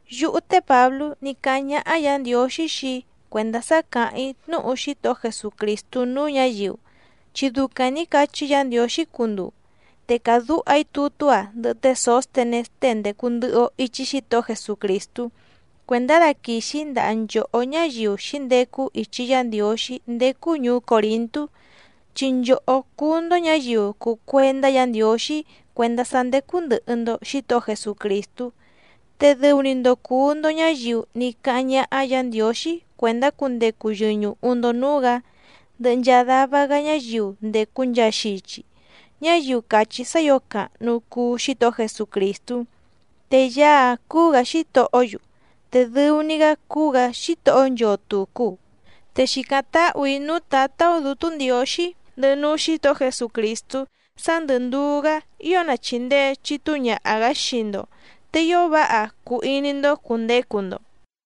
Yúhú té Pǎblú ní cáháⁿ ñáhá Yǎ Ndiǒxí xii‑í cuèndá sá càháⁿ‑í tnúhu Xítohó Jesucrìstú núú ñǎyiu, chi ducaⁿ nǐ cachí Yǎ Ndiǒxí cunduu. Te càdúha‑í tutú‑a ndɨhɨ té Sǒstenés tée ndècu ndɨhɨ‑o ichi Xítohó Jesucrìstú cuèndá daquìxi‑í ndaha nchòhó ñáyiu xǐndecu ichi Yá Ndiǒxí ndécú ñùú Còrintú, chi nchòhó cúú‑ndó ñǎyiu cùu cuendá Yǎ Ndiǒxí cuèndá sá ndécú ndɨ̀hɨ‑ndo Xítohó Jesucrìstú. Te dɨu‑ni‑ndo cùu‑ndo ñáyiu ní cáháⁿ ñáhá Yǎ Ndiǒxí cuèndá cundecu yɨñùhu‑ndo núú‑gǎ, ndɨhɨ nchaa dava‑gá ñáyiu ndècu nchaa xichi, ñáyiu càchí sá ǐo càhnu cuu Xítohó Jesucrìstú. Te Yaá‑áⁿ cúú‑gǎ Xítohó‑yu, te dɨu‑ni‑gá cúú‑gǎ Xítohó nchoo tùcu. Te xìcáⁿ táhù‑í núú Tǎtá‑ó Dǔtú Ndiǒxí ndɨhɨ núú Xǐtohó Jesucrìstú sá ndɨ̀ nduú‑gá ío na chìndee chitúu ñaha‑gǎ xii‑ndo, te ío váha cuu iní‑ndó cùndecu‑ndo.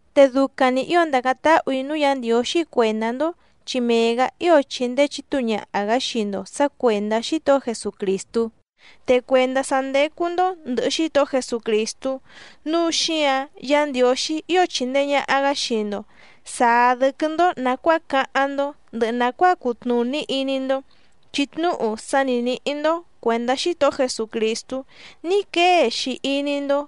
Te ducaⁿ‑ni ǐo ndàcáⁿ táhù‑í núú Yǎ Ndiǒxí cuèndá‑ndó, chi mee‑gǎ ío chìndee chitúu ñaha‑gá xii‑ndo sǎ cuèndá Xítohó Jesucrìstú. Te cuèndá sá ndécú‑ndó ndɨ̀hɨ Xítohó Jesucrìstú, núu xíǎⁿ Yǎ Ndiǒxí ío chìndee ñaha‑gá xii‑ndo sàá dɨ́quɨ́‑ndó nàcuáa cáháⁿ‑ndó, ndɨhɨ nàcuáa cùtnuní iní‑ndó, chi tnúhu sá ni nǐhí‑ndó cuèndá Xítohó Jesucrìstú ní quée‑xi iní‑ndó.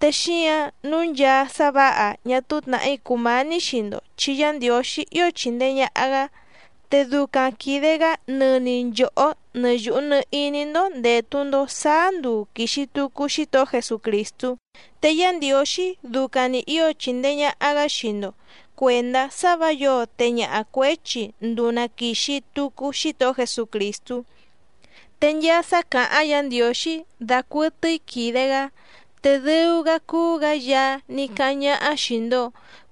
Te xíǎⁿ nǔu nchaa sá vǎha ñá túú tnàhí cùmání xii‑ndo chi Yá Ndiǒxí ío chìndee ñaha‑gá. Te ducaⁿ quìde‑gá nɨni nchòhó nɨ yùhu nɨ iní‑ndó ndètu‑ndo sáá nduu quìxi tucu Xítohó Jesucrìstú. Te Yá Ndiǒxí ducaⁿ‑ni ǐo chindee ñàha‑gá xii‑ndo cuèndá sá vǎ yǒo teñaha cuěchi nduu na quìxi tucu Xítohó Jesucrìstú. Te nchaa sá càháⁿ Yǎ Ndiǒxí dacuɨtɨ́í quìde‑gá, te dɨu‑gá cúú‑gǎ Yaá ní cáháⁿ ñáhá xìi‑ndo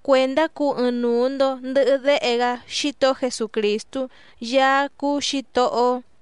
cuendá cuu ɨɨⁿnuu‑ndo ndɨ̀hɨ Déhe‑gá Xítohó Jesucrìstú Yaá cúú Xǐtohó‑ó.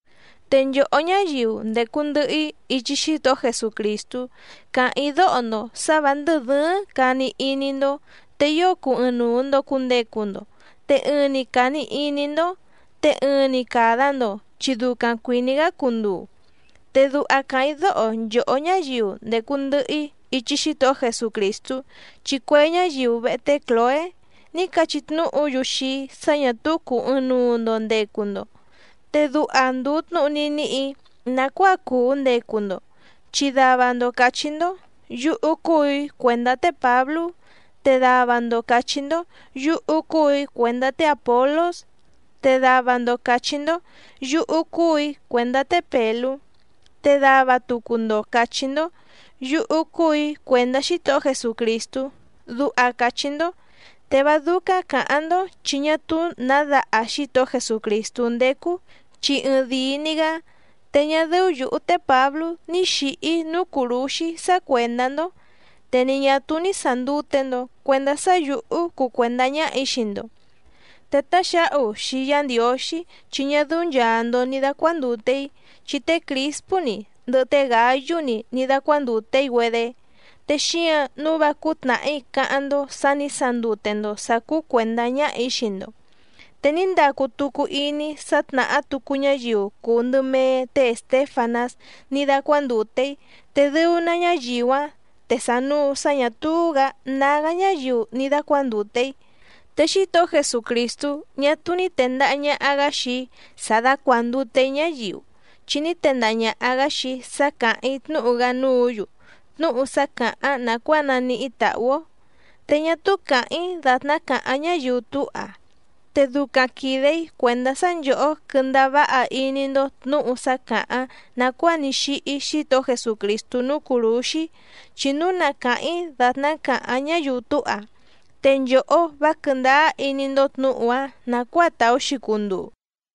Te nchòhó ñáyiu ndècu ndɨhɨ‑í ichi Xítohó Jesucrìstú càháⁿ‑í dóho‑ndo sǎ vǎ ndɨ̀ dɨ́ɨ́ⁿ càni iní‑ndó, te ío cuu ɨɨⁿnuu‑ndo cùndecu‑ndo, te ɨɨⁿ‑ni càni iní‑ndó, te ɨɨⁿ‑ni càda‑ndo chi ducaⁿ cuìní‑gá cunduu. Te duha càháⁿ‑í dóho nchòhó ñáyiu ndècu ndɨhɨ‑í ichi Xítohó Jesucrìstú, chi cue ñáyiu vehe té Clòé ní cachí tnúhu‑yu xii‑í sá ñà túú cùu ɨɨⁿnuu‑ndo ndecu‑ndo. Te duha ndùu tnúhu ní níhì‑í nàcuáa cùu ndecu‑ndo, chi dava‑ndo càchí‑ndó: “Yúhú cúù‑í cuèndá té Pǎblú.” Te dava‑ndo càchí‑ndó: “Yúhú cúù‑í cuèndá té Àpolós.” Te dava‑ndo càchí‑ndó: “Yúhú cúù‑í cuèndá té Pèlú.” Te dava tucu‑ndo càchí‑ndó: “Yúhú cúù‑í cuèndá Xítohó Jesucrìstú”, duha càchí‑ndó. Te vá dúcáⁿ cǎháⁿ‑ndó chi ñá túú nǎ daha Xítohó Jesucrìstú ndécú chi ɨɨⁿdìi‑ni‑gá. Te ñá dɨ́ú yǔhú té Pǎblú ní xǐhí‑í núú cùrúxí sá cuèndá‑ndó, te ni ñà túú ní sàndute‑ndo cuendá sá yǔhú cuu cuèndá ñáhà‑í xii‑ndo. Te táxǎhu xii Yá Ndiǒxí chi ñá dɨ́ú nchàa‑ndo ni dacuandute‑í, chi té Crìspú‑ni ndɨhɨ té Gǎyú‑ni ní dácuándùte‑í‑güedé. Te xíǎⁿ nǔu vá cúú tnàhí cáháⁿ‑ndó sǎ nǐ sandute‑ndo sǎ cúú cuèndá ñáhà‑í xii‑ndo. Te ní ndacu tucu iní‑í sá tnàhá tucu ñáyiu cùu ndɨ mee té Èstéfanás ní dácuándùte‑í, te dɨu‑ná ñáyiu‑áⁿ te sànuu sá ñà túú‑gǎ nágá ñáyiu ni dàcuandute‑í. Te Xítohó Jesucrìstú ñá túú ní tèndaha ñaha‑gá xii‑í sá dácuàndute‑í ñáyiu, chi ní tendaha ñàha‑gá xii‑í sá càháⁿ‑í tnúhu‑gá núǔ‑yu, tnúhu sá càháⁿ nàcuáa naníhí tàhú‑ó. Te ñá túú càháⁿ‑í dàtná càháⁿ ñáyiu túha. Te ducaⁿ quìde‑í cuèndá sá nchòhó quɨ́ndáá váha iní‑ndó tnǔhu sá càháⁿ nàcuáa ní xíhí Xítohó Jesucrìstú núú cùrúxí. Chi núu na càháⁿ‑í dàtná càháⁿ ñáyiu túha te nchòhó vá quɨ̀ndáá iní‑ndó tnǔhu‑áⁿ nàcuáa tàú‑xi cunduu.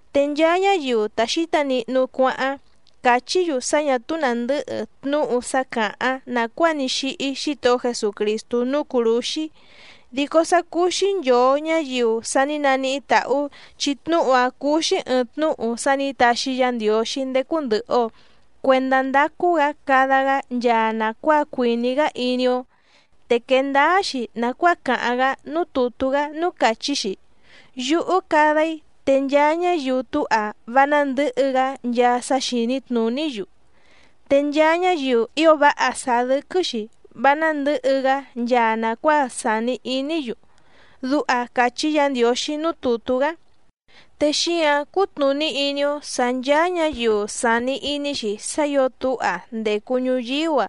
Te nchaa ñáyiu ta xǐta nihnu cuáháⁿ càchí‑yu sá ñà túú nàndɨ́hɨ tnúhu sá càháⁿ nàcuáa ní xíhí Xítohó Jesucrìstú núú cùrúxí, dico sá cúú‑xí nchòo ñáyiu sa ní naníhí tàhú, chi tnúhu‑áⁿ cúú‑xí ɨ̀ɨⁿ tnúhu sá nǐ taxi Yá Ndiǒxí ndécú ndɨ̀hɨ‑o cuendá ndacu‑gá cada‑gá nchaa nàcuáa cuìní‑gá iní‑ó, te quèe ndáá‑xi nàcuáa càháⁿ‑gá núú tùtú‑gá núú càchí‑xi: Yúhú cada‑í te nchaa ñáyiu túha vá nándɨ̌hɨ‑gá nchaa sá xìní tnùní‑yu, te nchaa ñáyiu ío váha sàá dɨ́quɨ́‑xi vá nándɨ̌hɨ‑gá nchaa nàcuáa sàni iní‑yu. Duha càchí Yǎ Ndiǒxí núú tùtú‑gá. Te xíǎⁿ cútnùní iní‑ó sǎ ncháá ñǎyiu sàni iní‑xi sá ǐo túha ndècu ñuyíú‑a,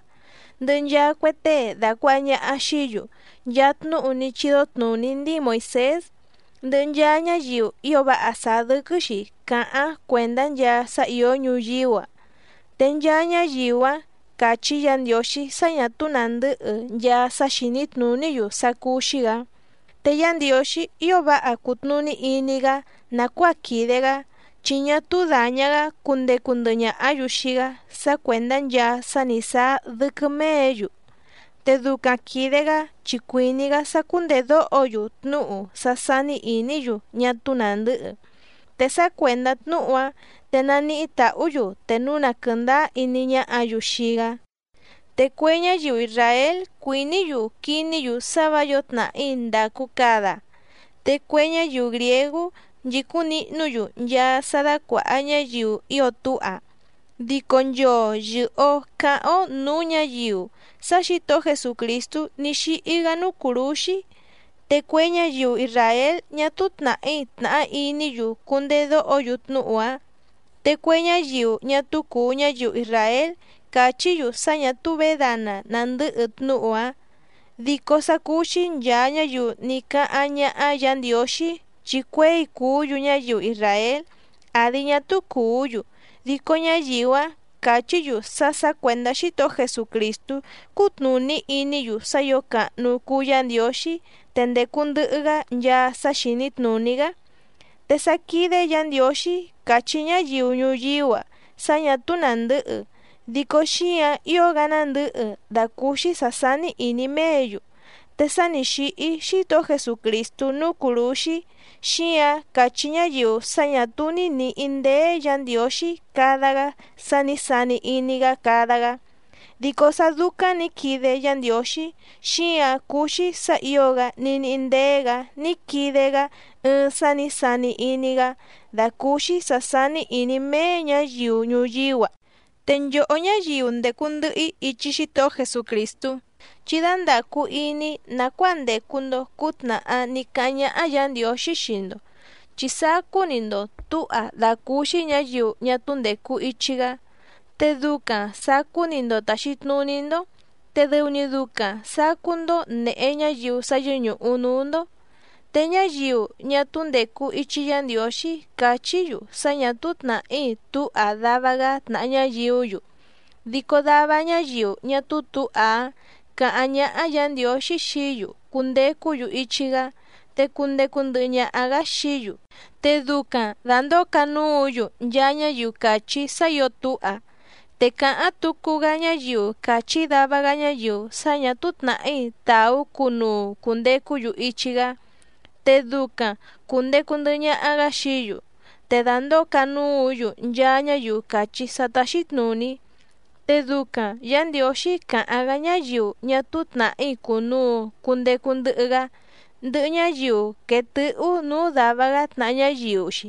ndɨhɨ nchaa cue tée dàcuaha ñaha xií‑yu nchaa tnúhu ní chídó tnùní ndíi Moìsés, ndɨhɨ nchaa ñáyiu ío váha sàá dɨ́quɨ́‑xi càháⁿ cuèndá nchaa sá ìó ñuyíú‑a, te nchaa ñáyiu‑áⁿ càchí Yǎ Ndiǒxí sá ñà túú nàndɨ́hɨ nchaa sá xìní tnùní‑yu sá cúú‑xí‑gǎ. Te Yá Ndiǒxí ío váha cùtnuní iní‑gá nàcuáa quìde‑gá, chi ñá túú dàña‑gá cundecu ndɨhɨ ñàhá‑yu xii‑gá sá cuèndá nchaa sá nǐ sáá dɨ́quɨ́ méě‑yu, te ducaⁿ quìde‑gá chi cuìní‑gá sá cúndèdóho‑yu tnúhu sá sání ìní‑yu ñá túú nàndɨ́hɨ. Te sá cuèndá tnúhu‑áⁿ te naníhí tàhú‑yu te núu na quɨ̀ndáá iní ñáhǎ‑yu xii‑gá. Te cue ñáyiu isràél cuìní‑yu quiní‑yu sá vǎ yǒo tnàhí ndàcu cada, te cue ñáyiu grìégú nchìcúⁿ nihnú‑yu nchaa sá dácuàha ñáyiu ío túha. Dico nchoo yɨ̀hɨ‑o cáháⁿ‑ó nǔú ñǎyiu sá Xǐtohó Jesucrìstú ní xíhí‑gá núú cùrúxí. Te cue ñáyiu isràél ñá túú tnàhí tnàhá iní‑yu cundedóho‑yu tnúhu‑áⁿ. Te cue ñáyiu ñá túú cùu ñáyiu isràél càchí‑yu sá ñà túú vědana nàndɨ́hɨ tnúhu‑áⁿ. Dico sá cúú‑xí nchàa ñáyiu ní cáháⁿ ñáhá Yǎ Ndiǒxí chi cuěi cùú‑yu ñáyiu isràél àdi ñá túú cùú‑yu, dico ñáyiu‑áⁿ càchí‑yu sá sǎ cuèndá Xítohó Jesucrìstú cútnùní iní‑yu sá ǐo càhnu cuu Yá Ndiǒxí te ndècu ndɨhɨ‑gá nchaa sá xìní tnùní‑gá. Te sá quídé Yǎ Ndiǒxí càchí ñáyiu ñuyíú‑a sá ñà túú nàndɨ́hɨ, dico xíǎⁿ ío‑gá nándɨ̌hɨ dàcúúxí sǎ sání ìní méě‑yu. Te sá nǐ xíhí Xítohó Jesucrìstú núú cùrúxí, xíǎⁿ càchí ñáyiu sá ñǎ túú ní nìhí ndéé Yǎ Ndiǒxí cada‑gá sá nǐ sani iní‑gá cada‑gá. Dico sá dúcáⁿ nǐ quide Yá Ndiǒxí, xíǎⁿ cúú‑xí sǎ ǐo‑gá ní níhí ndéé‑gǎ ní quide‑gá ɨɨⁿ sá nǐ sani iní‑gá dàcúúxí sǎ sání ìní méé ñǎyiu ñuyíú‑a. Te nchòhó ñáyiu ndècu ndɨhɨ‑í ichi Xítohó Jesucrìstú, chí dándàcu iní nàcuáa ndècu‑ndo cútnàhá ní cáháⁿ ñáhá Yǎ Ndiǒxí xii‑ndo, chi sacú‑ni‑ndo tǔha dàcúúxí ñǎyiu ñá túú ndècu ichi‑gá. Te ducaⁿ sàcú‑ni‑ndo tàxi tnuní‑ndó, te dɨu‑ni ducaⁿ sàcú‑ndó nèhe ñáyiu sá yɨ́ñùhu núú‑ndó. Te ñáyiu ñá túú ndècu ichi Yá Ndiǒxí càchí‑yu sá ñà túú tnàhí túha dava‑gá tnàha ñáyiú‑yu, dico dava ñáyiu ñá túú tǔha‑áⁿ càháⁿ ñáhá Yǎ Ndiǒxí xií‑yu cundecú‑yu ichi‑gá, te cundecu ndɨhɨ ñaha‑gǎ xií‑yu, te ducaⁿ dàndóo canúǔ‑yu nchaa ñáyiu càchí sá ǐo túha. Te càháⁿ tucu‑gá ñáyiu càchí dava‑gá ñáyiu sá ñà túú tnàhí tàú cunuu cùndecú‑yu ichi‑gá, te ducaⁿ cùndecu ndɨhɨ ñaha‑gá xií‑yu, te dàndóo canúǔ‑yu nchaa ñáyiu càchí sá táxí tnùní. Te ducaⁿ Yǎ Ndiǒxí càháⁿ‑gá ñáyiu ñá túú tnàhí cùnuu cundecu ndɨhɨ‑gá, ndɨhɨ ñáyiu quèe tɨ́hú nǔú dàva‑gá tnàha ñáyiu‑xi,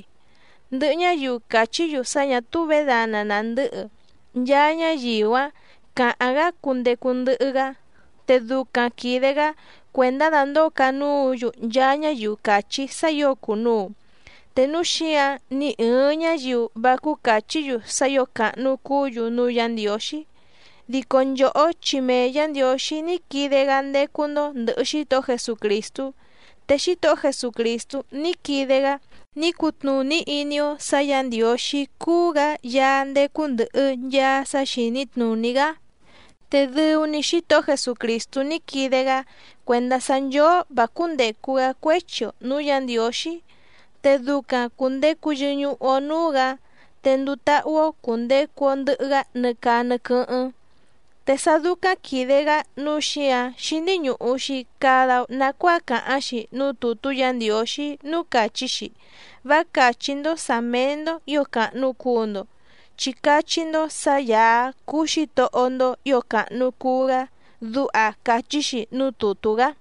ndɨhɨ ñáyiu càchí‑yu sá ñà túú vědana nàndɨ́hɨ, nchaa ñáyiu‑áⁿ càháⁿ‑gá cundecu ndɨhɨ‑gá, te ducaⁿ quìde‑gá cuèndá dàndóo canúǔ‑yu nchaa ñáyiu càchí sá ǐo cùnuu. Te núu xíǎⁿ ni ɨ̀ɨⁿ ñáyiu vá cúú càchí‑yu sá ǐo càhnu cuú‑yu núú Yǎ Ndiǒxí. Dico nchòhó chi mee Yǎ Ndiǒxí ní quide‑gá ndécú‑ndó ndɨ̀hɨ Xítohó Jesucrìstú, te Xítohó Jesucrìstú ní quide‑gá ní cutnùní iní‑ó sǎ Yǎ Ndiǒxí cúú‑gǎ Yaá ndécú ndɨ̀hɨ nchaa sá xìní tnùní‑gá. Te dɨu‑ni Xítohó Jesucrìstú ní quide‑gá cuèndá sá nchóó vǎ cúndècu‑gá cuéchi‑o nǔú Yǎ Ndiǒxí, te ducaⁿ cùndecu yɨñuhu‑o núú‑gǎ, te nduu táhú‑ó cùndecu‑o ndɨhɨ‑gá nɨ caa nɨ quɨ́hɨ́ⁿ. Te sá dúcáⁿ quìde‑gá nǔu xíǎⁿ xíní ñùhu‑xi cada‑o nacuáa càháⁿ‑xi núú tùtú Yǎ Ndiǒxí núú càchí‑xi: “Vá càchí‑ndó sǎ méé‑ndó ǐo càhnu cuu‑ndo, chi cachí‑ndó sǎ Yàá cúú Xǐtohó‑ndó ǐo càhnu cuu‑gá”, duha càchí‑xi núú tùtú‑gá.